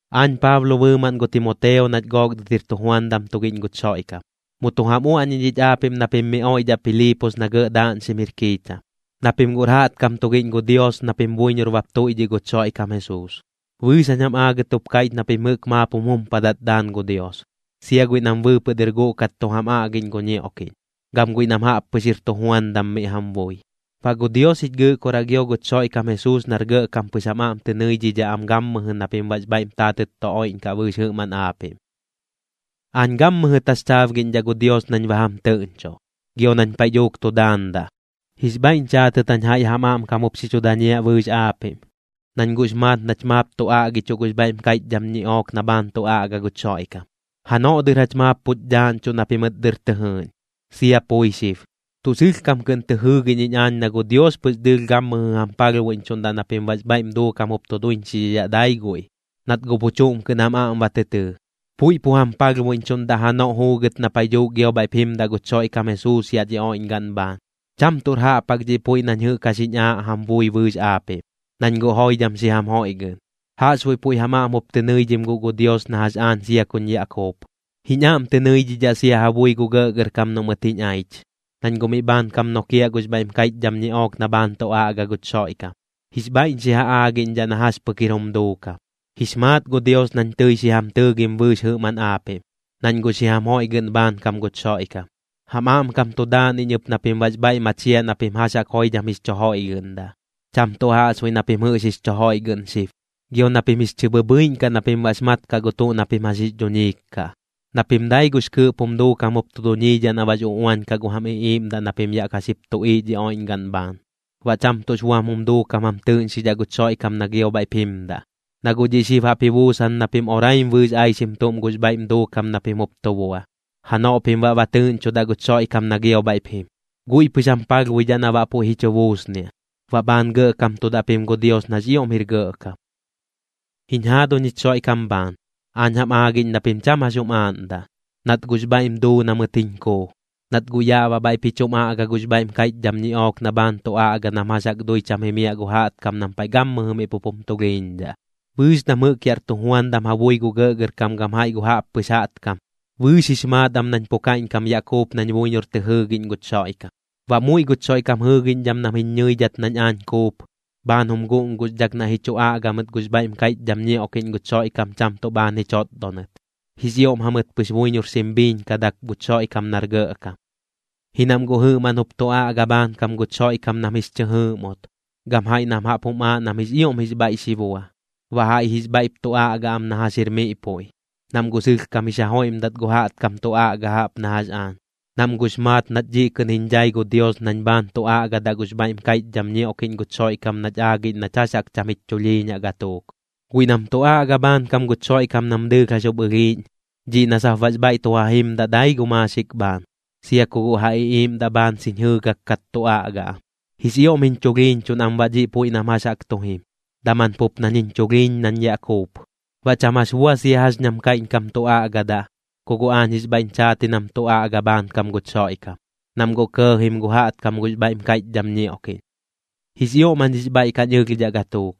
Aañ Paablo bɨɨmaꞌn gu Timoteo nach gook dɨt jir tujuandam tugiꞌñ guch Xoiꞌkam, mu tu jam uaꞌñiꞌñ ich aapiꞌm na pim miꞌ oiꞌdhaꞌ Piliipos na gɇꞌ daaꞌñxim jir kiicham, na pim guꞌr jaꞌtkam tugiꞌñ gu Dios na pim buiñor bap tuiꞌdhiꞌ guch Xoiꞌkam Jesuus. Bɨɨx jañ jam aagɨt jup kaiꞌch na pim jɨꞌk maap jum jumpadat daan gu Dios, sia guiꞌ nam bɨɨpɨꞌ dɨr guꞌkat tu jam aꞌgiꞌñ gu ñioꞌkiꞌñ, gam guiꞌ nam jaꞌppɨx jir tujuandam miꞌ jam bui. Baꞌ gu Dios jich Gɨꞌkoraꞌ gio guch Xoiꞌkam Jesuus nar gɇꞌkam pɨx jam aꞌm tɨ nɨidhidhaꞌ am gammɨjɨ na pim baꞌx bhaiꞌm taatɨt tu oiꞌñkaꞌ bɨɨx jɨꞌmaꞌn aapiꞌm. Aañ gammɨjɨ taxchaabgiꞌñdhaꞌ gu Dios nañ ba jam tɨꞌñchoꞌ, gio nañ paiꞌ dhuuk tu daandaꞌ, jix bhaiꞌñ chaatɨt jañ jaiꞌ jam aꞌmkam jup xi chu dañiaꞌ bɨɨx aapiꞌm. Nañ guꞌx maat nach maap tu aꞌgichuꞌ gux bhaiꞌm kaiꞌchdham ñiꞌook na bhaan tu aꞌga guch Xoiꞌkam, janoꞌ dɨr jach maap puch dhaaꞌñchuꞌ na pimɨt dɨr tɨ jɨɨꞌñ, sia pui xib. Tuꞌ sɨlhkam kɨꞌn tɨ jɨɨgiꞌñ iñ aañ na gu Dios pɨx dɨɨlh gammɨjɨ jam palhbuiꞌñchuꞌndaꞌ na pim baꞌx bhaiꞌm duukam jup tu duiñxidhidhaꞌ dai guiꞌ, nat guꞌ pu chuꞌm kɨꞌn jam aꞌm ba tɨ tɨɨ, puiꞌ pu jam palhbuiꞌñchuꞌndaꞌ janoꞌ juugɨt na paiꞌ dhuuk gio bhaiꞌp jimdaꞌ guch Xoiꞌkam Jesuus yaꞌ dhi oiꞌñgaꞌn bhaan. Cham tuꞌr jaꞌp jaꞌk dhiꞌ puiꞌ nañ jɨꞌk jax jiñ aaꞌ jam bui bɨɨx aapiꞌm, nañ guꞌ joidham xi jam joiꞌgɨꞌn, jaꞌxbuiꞌ puiꞌ jam aꞌm jup tɨ nɨidhim guꞌ gu Dios na jax aañ sia kuñ yaꞌ kuup. Jiñ aꞌm tɨ nɨidhidhaꞌ sia ja bui gu gɇꞌgɇrkam noꞌ mɨt jiñ aich, nañ guꞌ miꞌ bhaankam nokiaꞌ gux bhaiꞌm kaiꞌchdham ñiꞌook na bhaan tu aꞌga guch Xoiꞌkam, jix bhaiꞌñ xi ja aagiꞌñdhaꞌ na jax pɨk jir jum duukam. Jix maat gu Dios nañ tɨi xi jam tɨɨgim bɨɨx jɨꞌmaꞌn aapiꞌm, nañ guꞌ xi jam joiꞌgɨꞌn bhaankam guch Xoiꞌkam. Jam aꞌmkam tu daan iñ ɨp na pim baꞌx bhaiꞌ machiaꞌ na pim jax jaꞌk joidham jix chu joiꞌgɨꞌndaꞌ, cham tuꞌ jaꞌxbuiꞌ na pim jɨꞌx jix chu joiꞌgɨꞌn xib, gio na pim jix chɨ bhɨbhɨiꞌñ kaꞌ na pim baꞌx mat kaꞌ gu tuꞌ na pim jax jix dhuñiik kaꞌ, na pim dai gux kɨɨꞌp jum duukam jup tu duñiidhaꞌ na baꞌx uꞌuañ kaꞌ gu jam iꞌiiꞌmdaꞌ na pim yaꞌ ka xip tuꞌiiꞌ dhi oiꞌñgaꞌn bhaan, baꞌ cham tuꞌx buam jum duukam jam tɨɨꞌñxidhaꞌ guch Xoiꞌkam na gio bhaiꞌp jimdaꞌ. Na guꞌ dhiꞌ xib jaꞌp ji buusan na pim oraim bɨɨx aixim tuꞌm gux bhaiꞌm duukam na pim jup tu bua, janoꞌ pim baꞌ ba tɨɨꞌñchudaꞌ guch Xoiꞌkam na gio bhaiꞌp jim. Guiꞌ pɨx jam palhbuidhaꞌ na baꞌ puiꞌ ji chu buusniaꞌ, baꞌ bhaan gɇꞌkamtudaꞌ pim gu Dios nax ioꞌm jir gɇꞌkam. Jiñ jaaduñ jich Xoiꞌkam bhaan, aañ jam aagiꞌñ na pim cham jax jum aaꞌndaꞌ, nat guꞌx bhaiꞌm duu na mɨt jiñ kuu, nat guꞌ yaꞌ baꞌ bhaiꞌp ji chum aꞌga gux bhaiꞌm kaiꞌchdham ñiꞌook na bhaan tu aꞌga nam jax jaꞌk dui cham jimiaꞌ gu jaꞌtkam nam paiꞌ gammɨjɨ miꞌ pup jum tulhiiñdhaꞌ. Bɨɨx nam jɨꞌk yaꞌr tujuandam ja bui gu gɇꞌgɇrkam gam jaiꞌ gu jaꞌppɨx jaꞌtkam, bɨɨx jix maat am nañ pu kaiꞌñkam yaꞌ kuup nañ buiñor tɨ jɨɨgiꞌñ guch Xoiꞌkam. Baꞌ muiꞌ guch Xoiꞌkam jɨɨgiꞌñdham nam jiñ ñɨidhat nañ aañ kuup, bhaan jum guꞌnguxdhak naiꞌ ji chu aꞌga mɨt gux bhaiꞌm kaiꞌchdham ñioꞌkiꞌñ guch Xoiꞌkam cham tuꞌ bhaan ji chotdonɨt, jix ioꞌm jamɨt pɨx buiñor xim biiñkadak guch Xoiꞌkam nar gɇꞌkam. Ji nam guꞌ jɨꞌmaꞌn jup tu aꞌga bhaankam guch Xoiꞌkam nam jix chɨ jɨɨꞌmut, gam jaiꞌ nam jaꞌp jum aaꞌ nam jix ioꞌm jix bhaiꞌ xi bua. Baꞌ jaiꞌ jix bhaiꞌp tu aꞌga am na jax jir miꞌ puiꞌ, nam guꞌ sɨlhkam jix ja joiꞌmdat gu jaꞌtkam tu aꞌga jaꞌp na jax aañ, nam guꞌx maat nat dhiꞌ kɨꞌn jiñ dhai gu Dios nañ bhaan tu aꞌgaꞌdaꞌ gux bhaiꞌm kaiꞌchdham ñioꞌkiꞌñ guch Xoiꞌkam nach aagiꞌñ nach jax jaꞌk cham jich chulhiiñaꞌ gatuuk. Guiꞌ nam tu aꞌga bhaankam guch Xoiꞌkam nam dɨɨlh jax jup ɨlhiiꞌñ, dhiꞌ na sap baꞌx bhaiꞌ tu ja jimdaꞌ dai gu maaxik bhaan, sia ku guꞌ ja iꞌiiꞌmdaꞌ bhaan xiñ jɨɨgak kat tu aꞌga am. Jix ioꞌm jiñ chulhiiñchuꞌn am baꞌ dhiꞌ puiꞌ nam jax jaꞌk tu jim, daman pup nañ jiñ chulhiiñ nañ yaꞌ kuup. Baꞌ cham jax bua sia jax ñam kaiꞌñkam tu aꞌgadaꞌ, ku guꞌ aañ jix bhaiꞌñ chaat ji nam tu aꞌga bhaankam guch Xoiꞌkam, nam guꞌ kɇɇjim gu jaꞌtkam gux bhaiꞌm kaiꞌchdham ñioꞌkiꞌñ. Jix ioꞌm jañ jix bhaiꞌ kañ ɨlhdhaꞌ gatuuk,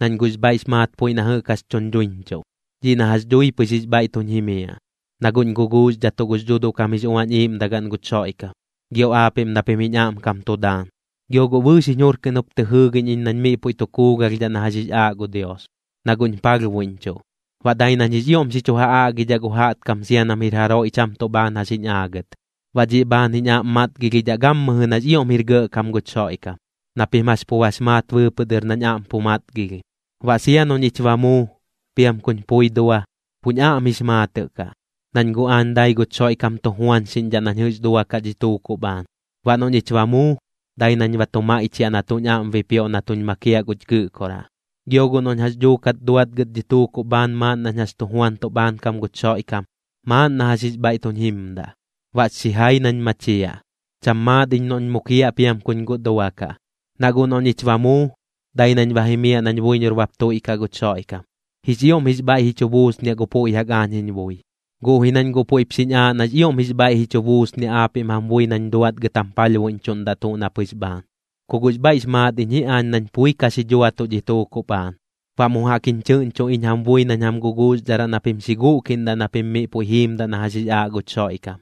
nañ guꞌx bhaiꞌx maat puiꞌ na jɨꞌk jax tuñ dhuiñchuꞌ, dhiꞌ na jax dhui pɨx jix bhaiꞌ tuñ jimiaꞌ, na guꞌñ guguuxdhatuꞌ gux Dhuuduꞌkam jix Uañ Iiꞌmdagaꞌn guch Xoiꞌkam, gio aapiꞌm na pim jiñ aꞌmkam tu daan. Gio guꞌ bɨɨx jiñ jur kɨꞌn jup tɨ jɨɨgiꞌñ iñ nañ miꞌ puiꞌ tu kuugalhdhaꞌ na jax jix aaꞌ gu Dios, na guꞌñ palhbuiꞌñchuꞌ, baꞌ dai nañ jix ioꞌm xi chu ja aꞌgidhaꞌ gu jaꞌtkam sia nam jir jaroiꞌ cham tuꞌ bhaan jax jiñ aagɨt. Baꞌ dhiꞌ bhaan jiñ aꞌm matgilhidhaꞌ gammɨjɨ nax ioꞌm jir gɇꞌkam guch Xoiꞌkam, na pim jax pu bax maat bɨɨpɨꞌ dɨr nañ aꞌm pu matgilhim. Baꞌ sia noꞌ ñich ba muu, piam kuñ pui dua, puñ aꞌm jix maatɨꞌ kaꞌ. Nañ guꞌ aañ dai guch Xoiꞌkam tu juañxiꞌñdhaꞌ nañ jɨꞌx duakaꞌ dhi tuukuꞌ bhaan. Baꞌ noꞌ ñich ba muu, dai nañ ba tu maiꞌchiaꞌ na tuꞌñ aꞌm bipioꞌ na tuñ makiaꞌ guch Gɨꞌkoraꞌ. Gio guꞌ noꞌñ jax dhuukat duatgɨt dhi tuukuꞌ bhaan maaꞌn nañ jax tu juantuꞌ bhaankam guch Xoiꞌkam, maaꞌn na jax jix bhaiꞌ tuñ jimdaꞌ. Baꞌx xijai nañ machiaꞌ. Cham maat iñ noꞌñ mukiaꞌ piam kuñ guꞌ duakaꞌ. Na guꞌ noꞌ ñich ba muu, dai nañ ba jimiaꞌ nañ buiñor bap tuiꞌkaꞌ guch Xoiꞌkam. Jix ioꞌm jix bhaiꞌ ji chu buusniaꞌ gu puiꞌ jaꞌk aañ jiñ bui. Guꞌ ji nañ guꞌ puiꞌp xiñ aaꞌ nax ioꞌm jix bhaiꞌ ji chu buusniaꞌ aapiꞌm jam bui nañ duatgɨt jam palhbuiꞌñchuꞌndaꞌ tuꞌ na pɨx bhaan. Ku guꞌx bhaiꞌx maat iñ ji aañ nañ pui ka xi dhuatuꞌ dhi tuukuꞌ bhaan, baꞌ mu jaꞌk jiñ chɨꞌñcho iñ jam bui nañ jam guguuxdharaꞌ na pim xi guꞌkiꞌndaꞌ na pim miꞌ puiꞌ jiimdaꞌ na jax jix aaꞌ guch Xoiꞌkam,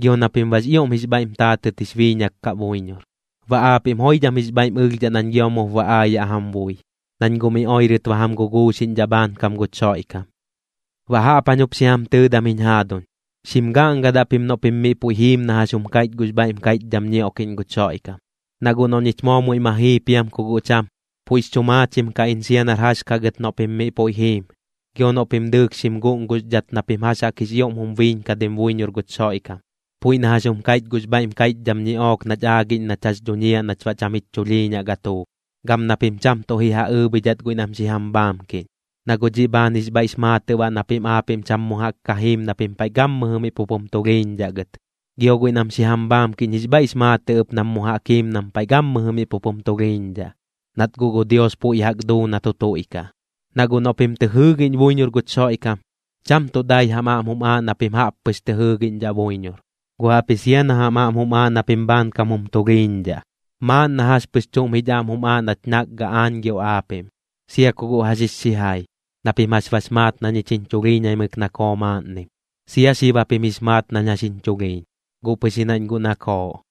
gio na pim baꞌx ioꞌm jix bhaiꞌm taatɨt jix biiñak kaꞌ buiñor. Baꞌ aapiꞌm joidham jix bhaiꞌm ɨlhdhaꞌ nañ gio mup ba aayaꞌ jam bui, nañ guꞌ mi oirɨt ba jam guguuxiꞌñdhaꞌ bhaankam guch Xoiꞌkam. Baꞌ jaꞌp jañ jup xi jam tɨɨdam jiñ jaaduñ, xim gaꞌngadaꞌ pim noꞌ pim miꞌ puiꞌ jiim na jax jum kaiꞌch gux bhaiꞌm kaiꞌchdham ñioꞌkiꞌñ guch Xoiꞌkam. Na guꞌ noꞌ ñich moo muiꞌ ma jii piam ku guꞌ cham, puiꞌx chu maachim kaꞌ iñ sia nar jax kaꞌ gɨt noꞌ pim miꞌ puiꞌ jiim, gio noꞌ pim dɨɨlh xim guꞌnguxdhat na pim jax jaꞌk jix ioꞌm jum biiñkadim buiñor guch Xoiꞌkam, puiꞌ na jax jum kaiꞌch gux bhaiꞌm kaiꞌchdham ñiꞌook nach aagiꞌñ nach jax dhuñiaꞌ nach baꞌ cham jich chulhiiñaꞌ gatuuk. Gam na pim cham tuꞌ ji ja ɨɨbhidhat guiꞌ nam xi jam bhaamkiꞌñ, na guꞌ dhiꞌ bhaan jix bhaiꞌx maatɨꞌ baꞌ na pim aapiꞌm cham mu jaꞌk ka jiim na pim paiꞌ gammɨjɨ miꞌ pup jum tulhiiñdhaꞌ gɨt, gio guiꞌ nam xi jam bhaamkiꞌñ jix bhaiꞌx maatɨꞌ ɨp nam mu jaꞌk jiim nam paiꞌ gammɨjɨ miꞌ pup jum tulhiiñdhaꞌ, nat guꞌ gu Dios puiꞌ jaꞌk duu na tu tuiꞌkaꞌ. Na guꞌ noꞌ pim tɨ jɨɨgiꞌñ buiñor guch Xoiꞌkam, cham tuꞌ dai jam aꞌm jum aaꞌ na pim jaꞌp pɨx tɨ jɨɨgiꞌñdhaꞌ buiñor, guꞌ jaꞌpji sia na jam aꞌm jum aaꞌ na pim bhaankam jum tulhiiñdhaꞌ. Maaꞌn na jax pɨx chuꞌm jich aꞌm jum aaꞌ nach nakgaꞌ aañ gio aapiꞌm, sia ku guꞌ jax jix xijai. Na pim jax bax maat na ñich jiñ chulhiiñaimɨk nakoo maaꞌnnim, sia xib japim jix maat nañ jax jiñ chulhiiñ, guꞌ pɨx ji nañ guꞌ nakooꞌ.